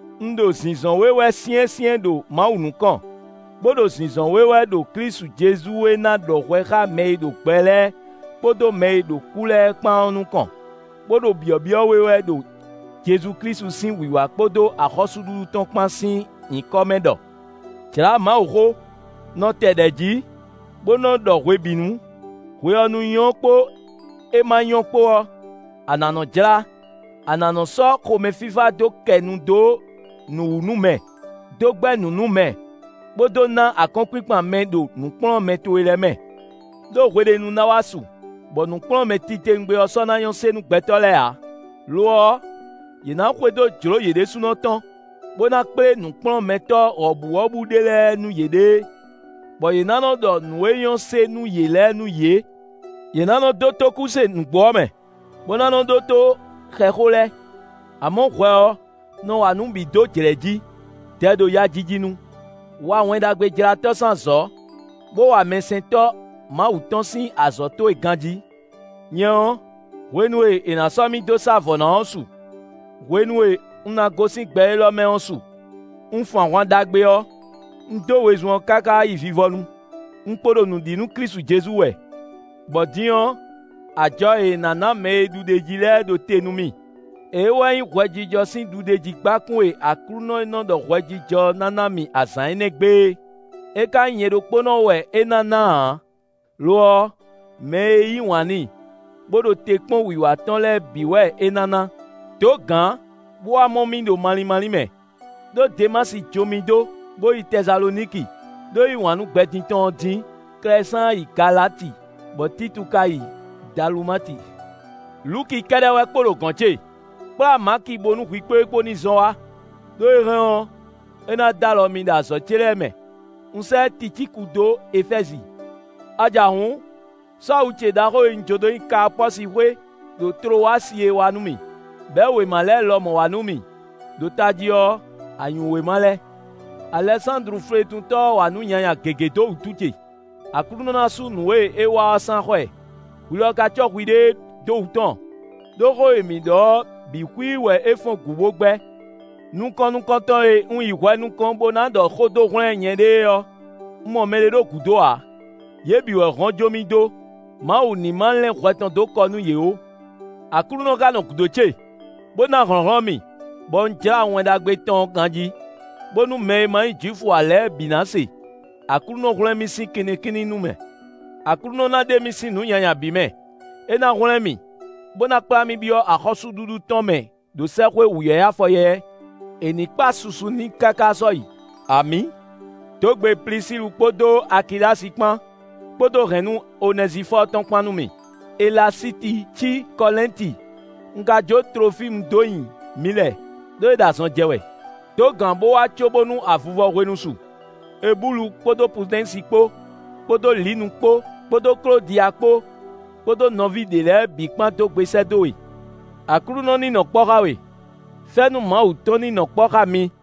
Un ɖo zǐnzɔ́n we wɛ syɛ́nsyɛ́n ɖo Mawu nukɔn, bó ɖo zǐnzɔ́n we wɛ ɖo Klísu Jezu e ná ɖɔ hwɛ xá mɛ e ɖo gbɛ lɛ́ɛ kpódó mɛ e ɖo kú lɛ́ɛ kpán ɔ́ nukɔn, bó ɖo byɔ̌byɔ́ we wɛ ɖo Jezu Klísu sín wǐwá kpódó axɔ́súɖuɖu tɔn kpán sín nyǐkɔ mɛ ɖɔ: Jlǎ Mawuxó; nɔ tɛ ɖɛ̌ jí, bó nɔ ɖɔ hwebǐnu; hwe ɔ́ nu nyɔ́ kpó é ma nyɔ́ kpó ɔ́, a nǎ nɔ́ jlá; a nǎ nɔ́ sɔ́ xomɛfífá dó kɛ nu dó nǔ wú nú mɛ, dó gbɛ́ nǔ nú mɛ, bó dó ná akɔ́nkpinkpan mɛ ɖo nǔkplɔ́nmɛ towe lɛ́ɛ mɛ. Đó hweɖénu ná wá su, bɔ nǔkplɔ́nmɛ titewungbe ɔ́ sɔ́ ná nyɔ́ se nú gbɛtɔ́ lɛ́ɛ ǎ; lo ɔ́, yě ná xwedó jlǒ yě ɖésúnɔ tɔn, bó ná kplé nǔkplɔ́nmɛtɔ́ wɔ̌buwɔ́bú ɖé lɛ́ɛ nú yěɖée, bɔ yě ná nɔ́ ɖɔ nǔ e nyɔ́ se nú yě lɛ́ɛ nú yě. Yě ná nɔ́ dó tókúse nǔgbó ɔ́ mɛ, bó ná nɔ́ ɖótó xɛxó lɛ́ɛ. Amɔ̌ hwɛ ɔ́, nɔ wa nǔ bǐ dó jlɛ̌ jí; dɛ ɖo yajiji nu; wa Wɛn Ɖagbejlátɔ́ sín azɔ̌, bó wa mɛsɛntɔ́ Mawu tɔn sín azɔ̌ towe ganjí. Nyɛ ɔ́, hwenu e è nǎ sɔ́ mì dó sá vɔ̌ ná ɔ́ su; hwenu e un ná gosín gbɛ élɔ́ mɛ ɔ́ su. Un fun ahwan ɖagbe ɔ́; un dó wezun ɔ́ káká yi vivɔnu; un kpo ɖo nǔ ɖi nú Klísu Jezu wɛ. Bɔ din ɔ́, ajɔ e è nǎ ná mɛ e ɖu ɖ'é jí lɛ́ɛ ɖo te nú mì; é wɛ nyí hwɛjijɔ sín ɖuɖéjígbákún e Aklúnɔ e nɔ́ ɖɔ hwɛjijɔ ɔ́ ná ná mì azǎn énɛ́ gbe é. É ka nyí nyɛ ɖokpónɔ wɛ é ná ná ǎ, lo ɔ́, mɛ e yí wǎn n'i, bó ɖo te kpɔ́n wǐwá tɔn lɛ́ɛ bǐ wɛ é ná ná. Dǒ gǎn bó wá mɔ mì ɖo malín málín mɛ. Đó Demási jó mì dó, bó yi Tɛsaloniki, ɖó é yí wǎn nú gbɛ din tɔn ɔ́ dín. Klɛsáan yi Galati, bɔ Títu ka yi Dalumati. Luki kɛ́ɖɛ́ wɛ kpo ɖo gɔ̌n ce; kplá Maki bónú hwi kpó e kpó ní zɔn wá; ɖó é hɛn ɔ́, é ná d'alɔ mì ɖo azɔ̌ ce lɛ́ɛ mɛ. Un sɛ́ Ticíku dó Efɛ́zi. A ja hǔn, sɔ́ awu ce ɖaxó e un jó dó nyi Kaapɔ́si xwé, ɖo Tlowasi é wá nú mì; bɛ̌ wěma lɛ́ɛ lɔmɔ̌ wá nú mì; ɖo tají ɔ́, anyǔwéma lɛ́ɛ. Alɛsándlu fletuntɔ́ ɔ́ wa nǔ nyanya gěgé dó wútu ce; Aklúnɔ ná sú nǔ e é wa ɔ́ sín axɔ́ ɛ. Hwi lɔ ka cɔ́ hwiɖée dó wǔ tɔn, ɖó xó e mǐ ɖɔ ɔ́ bǐ xwíí wɛ é fɔ́n gǔ bó gbɛ́. Nukɔn nukɔntɔn e un yi hwɛ nukɔn bó ná ɖɔ xó dó hwlɛ́n nyɛɖée ɔ́, un mɔ mɛɖé ɖo gǔdo ǎ; yě bǐ wɛ hɔn jó mì dó; Mawu ní ma lɛ́n hwɛ tɔn dó kɔ nú yě ó. Aklúnɔ ka nɔ gǔdo ce, bó ná hlɔ̌nhlɔ́n mì, bɔ un jlá wɛn Mawu tɔn ɔ́ ganjí, bónú mɛ e ma nyí Jwifu ǎ lɛ́ɛ bǐ ná se. Aklúnɔ hwlɛ́n mì sín kinnikínní nu mɛ. Aklúnɔ ná ɖe mì sín nǔ nyanya bǐ mɛ; é ná hwlɛ́n mì, bó ná kplá mì byɔ́ axɔ́súɖuɖu tɔn mɛ ɖo sɛ́xwé wǔyɛ́yɛ́ afɔyɛ́yɛ́. È ní kpa susu n'i káká sɔ́yi. Amǐ. Dǒ gbe Plisílu kpódó Akilási kpán, kpódó hɛ̌nnu Onɛzifɔ́ɔ tɔn kpán nú mì. Elasíti cí Kɔlɛ́nti. Un ka jó Tlofímu dó nyi Milɛ, ɖó é ɖo azɔn jɛ wɛ. Dǒ gǎn bó wá cóbónú avivɔ hwenu su. Ebúlu kpódó Pudɛ́nsi kpó, kpódó Linu kpó, kpódó Klódiya kpó, kpódó nɔví ɖě lɛ́ɛ bǐ kpán dó gbe sɛ́ dó we. Aklúnɔ ní nɔ kpɔ́ xá we. Fɛ́nú Mawu tɔn ní nɔ kpɔ́ xá mi.